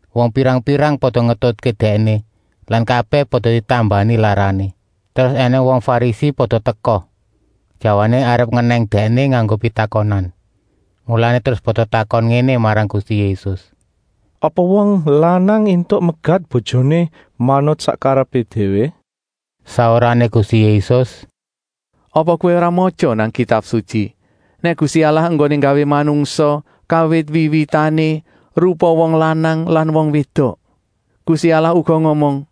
Wong pirang-pirang pada ngetutké Dèkné lan kabèh pada ditambani larané. Terus ènèng wong Farisi pada teka, jawané arep ngenèng Dèkné nganggo pitakonan. Mulané terus pada takon ngéné marang Gusti Yésus: “Apa wong lanang éntuk megat bojoné manut sak karepé déwé?” Saurané Gusti Yésus: “Apa kowé ora matya nang Kitab Sutyi nèk Gusti Allah enggoné nggawé manungsa kawit wiwitané rupa wong lanang lan wong wédok? Gusti Allah uga ngomong: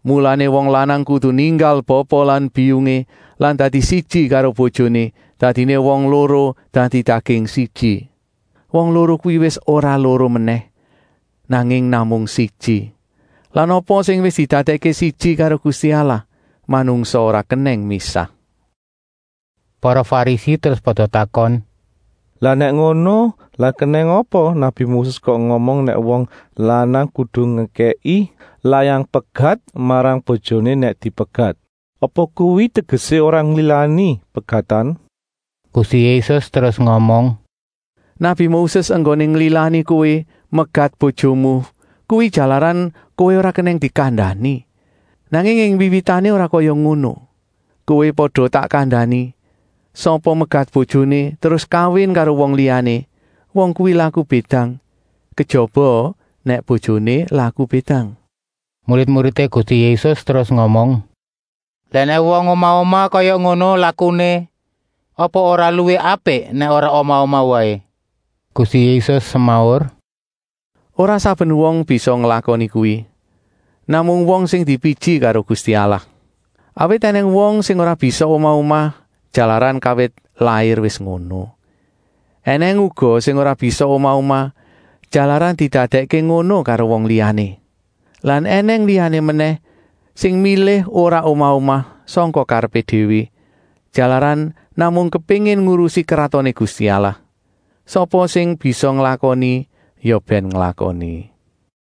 ‘Mulané wong lanang kudu ninggal bapa lan biyungé lan dadi siji karo bojoné, dadiné wong loro dadi daging siji.’ Wong loro kuwi wis ora loro menèh, nanging namung siji. Lan apa sing wis didadèkké siji karo Gusti Allah, manungsa ora kenèng misah.” Para Farisi terus pada takon: “Lah nèk ngono, lah kenèng apa nabi Moses kok ngomong nèk wong lanang kudu ngekèki layang pegat marang bojoné nèk dipegat? Apa kuwi tegesé ora nglilani pegatan?” Gusti Yésus terus ngomong: “Nabi Moses enggoné nglilani kowé megat bojomu kuwi jalaran kowé ora kenèng dikandani, nanging ing wiwitané ora kaya ngono! Kowé pada tak kandani: Sapa megat bojoné terus kawin karo wong liyané, wong kuwi laku bédang, kejaba nèk bojoné laku bédang.” Murid-muridé Gusti Yésus terus ngomong: “Lah nèk wong omah-omah kaya ngono lakuné, apa ora luwih apik nèk ora omah-omah waé.” Gusti Yésus semaur: “Ora saben wong bisa nglakoni kuwi, namung wong sing dipiji karo Gusti Allah. Awit ènèng wong sing ora bisa omah-omah, jalaran kawit lair wis ngono. Enèng uga sing ora bisa omah-omah, jalaran didadèkké ngono karo wong liyané. Lan ènèng liyané menèh sing milih ora omah-omah sangka karepé déwé, jalaran namung kepéngin ngurusi Kratoné Gusti Allah. Sapa sing bisa nglakoni, ya bèn nglakoni.”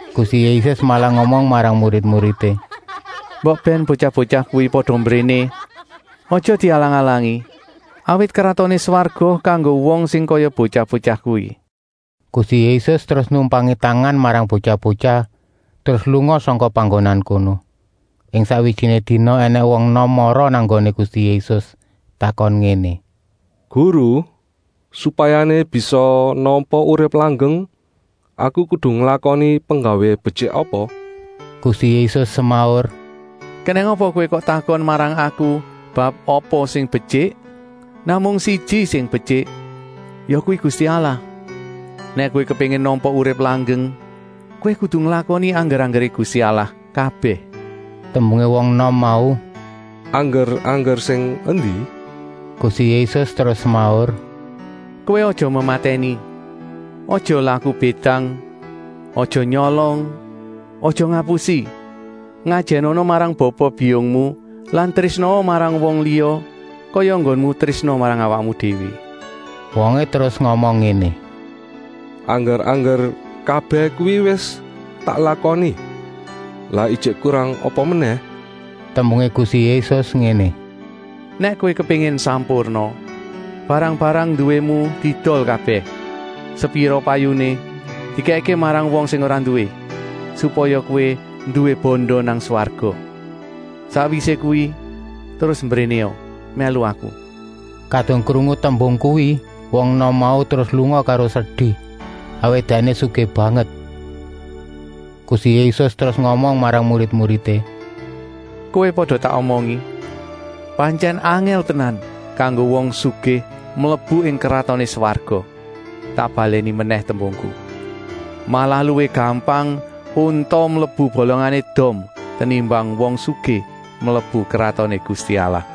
Gusti Yésus malah ngomong marang murid-muridé: “Mbok bèn botyah-botyah kuwi pada mbréné, aja dialang-alangi, awit Kratoné Swarga kanggo wong sing kaya botyah-botyah kuwi.” Gusti Yésus terus numpangi tangan marang botyah-botyah, terus lunga sangka panggonan kono. Ing sakwijiné dina ènèng wong enom mara nang nggoné Gusti Yésus, takon ngéné: “Guru, supayané bisa nampa urip langgeng, aku kudu nglakoni penggawé betyik apa?” Gusti Yésus semaur: “Kenèng apa kowé kok takon marang Aku bab apa sing betyik? Namung siji sing betyik, yakuwi Gusti Allah. Nèk kowé kepéngin nampa urip langgeng, kowé kudu nglakoni angger-anggeré Gusti Allah kabèh.” Tembungé wong enom mau: “Angger-angger sing endi?” Gusti Yésus terus semaur: “Kowé aja mematèni, aja laku bédang, aja nyolong, aja ngapusi. Ngajènana marang bapa-biyungmu lan trésnaa marang wong liya kaya enggonmu trésna marang awakmu déwé.” Wongé terus ngomong ngéné: “Angger-angger kabèh kuwi wis tak lakoni. Lah ijik kurang apa menèh?” Tembungé Gusti Yésus ngéné: “Nèk kowé kepéngin sampurna, barang-barang nduwému diedol kabèh. Sepira payuné dikèkké marang wong sing ora nduwé, supaya kowé nduwé banda nang swarga. Sakwisé kuwi terus mbrénéa mèlu Aku.” Kadung krungu tembung kuwi, wong enom mau terus lunga karo sedi, awit dèkné sugih banget. Gusti Yésus terus ngomong marang murid-muridé: “Kowé pada tak omongi: pantyèn angèl tenan kanggo wong sugih mlebu ing Kratoné Swarga. Tak balèni menèh tembungku: malah luwih gampang unta mlebu bolongané dom, tenimbang wong sugih mlebu Kratoné Gusti Allah.”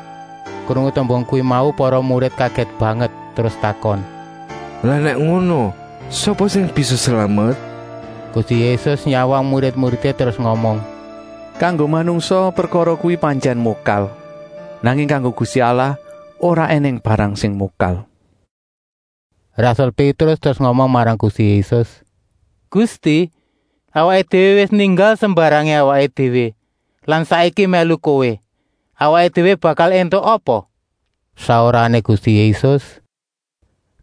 Krungu tembung kuwi mau para murid kagèt banget, terus takon: “Lah nèk ngono, sapa sing bisa slamet?” Gusti Yésus nyawang murid-muridé terus ngomong: “Kanggo manungsa prekara kuwi pantyèn mokal, nanging kanggo Gusti Allah ora ènèng barang sing mokal.” Rasul Pétrus terus ngomong marang Gusti Yésus: “Gusti, awaké déwé wis ninggal sembarangé awaké déwé lan saiki mèlu Kowé! Awaké déwé bakal éntuk apa?” Saurané Gusti Yésus: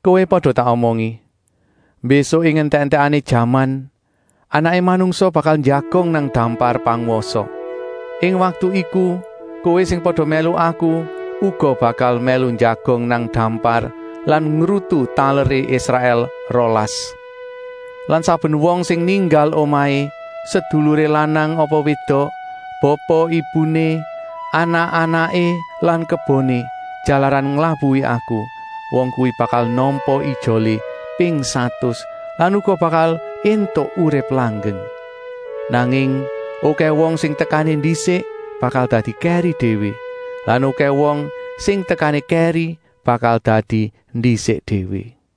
“Kowé pada tak omongi, mbésuk ing entèk-entèkané jaman Anaké Manungsa bakal njagong nang dampar pangwasa. Ing waktu iku kowé sing pada mèlu Aku uga bakal mèlu njagong nang dampar lan ngrutu taleré Israèl rolas. Lan saben wong sing ninggal omahé, seduluré lanang apa wédok, bapa-ibuné, anak-anaké lan keboné, jalaran nglabuhi Aku, wong kuwi bakal nampa ijolé ping satus lan uga bakal éntuk urip langgeng. Nanging okèh wong sing tekané ndisik bakal dadi kèri déwé lan okèh wong sing tekané kèri bakal dadi ndisik déwé.”